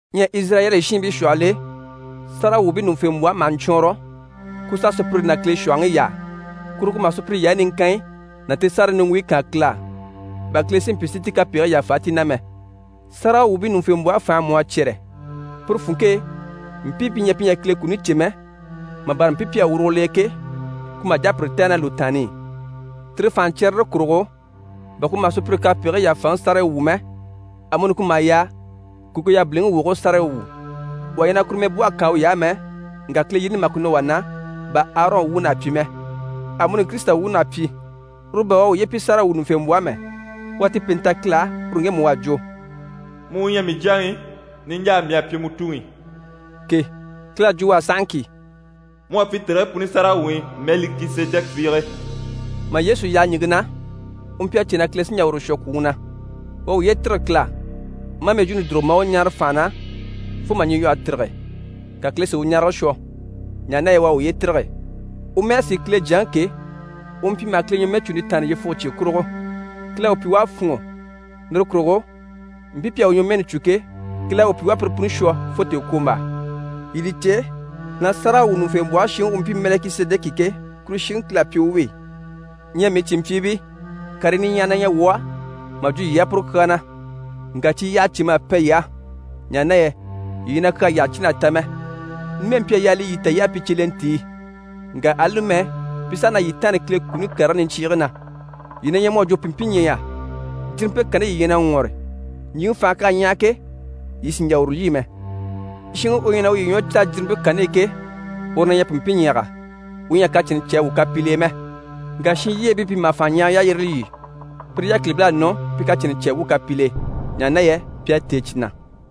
Ɲyɛ Izirayɛli shiinbii shwɔhɔl'e, sáragawwuubii ɲùŋufembwɔhe maha ɲcwɔɔnrɔ, ku s'a sùpyire ná Kile shwɔ̀hɔŋi yaa. Kuru ku maha sùpyire yaayi niŋkanyi ná ti sárayi niŋgwuyi kaan Kile á, bà Kile si mpyi si ti kapegigii yàfa ti na mɛ. Sáragawwuubii ɲùŋufembwɔhe fànhe mú à cyɛ́rɛ, puru funŋke e, mpii pi ɲyɛ pi ɲyɛ a Kile kuni cè mɛ, mà bâra mpii pi à wurugo l'e ke, ku maha jà a pire tɛ̀gɛ ná lùtaanni i. Tire fànhaɲcyɛrɛre kurugo, bà ku maha sùpyire kapegigii yàfaŋi sárayi wwû mɛ, amuni ku maha yaa ku ku yabiliŋi wogigii sárayi wwû. Wà ɲyɛ na kuru mɛbwɔhe kaan uy'á mɛ, ŋka Kile yini li maha ku nɔ wà na, bà Arɔn wuun'à pyi mɛ. Amuni Kirisita wuun'à pyi. Uru bà u à uye pyi sáragawwuɲuŋufembwɔhe mɛ. U à ti pèente ta Kile á, uru ŋgemu u à jwo: «Mu u ɲyɛ mii Jyaŋi, niɲjaa mii à pyi mu Tuŋi» ke. Kile à jwo u á sahaŋki: «Mu à pyi tèrigii puni sáragawwuŋi Mɛlikisedɛki fiige.» Mà Yesu yaha ɲìŋke na, u mpyi a cè na Kile sí n‑jà uru shwɔ kwùŋi na. U à uye tîrige Kile á, maa mɛjwuuni dùrugo maa u ɲáare fànha na fo mà ɲyilwɔhe tîrige, ka Kile si u ɲarege shwɔ, ɲaha na yɛ u à uye tîrige. U mɛ́n'à sìi Kile Jyaŋi ke, u mpyi maha Kile ɲwɔmɛɛcunte taanni yyefuge cye kurugo. Kile à u pyi u à fûnŋɔ. Lire kurugo mpii pi à u ɲwɔmɛɛni cû ke, Kile à u pyi u à pire puni shwɔ fo tèekwombaa. Yii li cè na sáragawwuɲuŋufembwɔhe shiŋi u mpyi Mɛlikisedɛki ke, kuru shiŋi Kile à pyi u wi. Ɲyɛ mii cìnmpyiibii, karii niɲyahagii na ɲyɛ wuu á mà jwo yii á puru kyaa na, ŋka cyi yyaha cèm'à pɛn yii á, ɲaha na yɛ yii ɲyɛ na kyaa yyaha cìn'a ta mɛ. Numɛ mpyi a yaa li yii ta yii à pyi cyelentii, ŋka ali numɛ, pi saha na yii taanni Kile kuni karigii niɲcyiigii na. Yii na ɲyɛ mu à jwo pìnmpinɲyɛya. Jirimpe kanni yii ɲyɛ na ŋwɔre, ɲjyìŋi fànhe k'à ɲyaha ke, yii sì n‑jà uru lyî mɛ. Shinŋi u ɲyɛ na uye ɲwɔ caa ná jirimpe kanni i ke, uru na ɲyɛ pìnmpinɲyaga, u ɲyɛ a kacɛnnɛ cè a wwû kapil'e mɛ. Ŋka shinlyeebii pi maha fànhaɲyahaga yalyire lyî, pire yákilibil'à nɔ pi kacɛnnɛ cè a wwû kapil'e, ɲaha na yɛ pi à têe cyi na.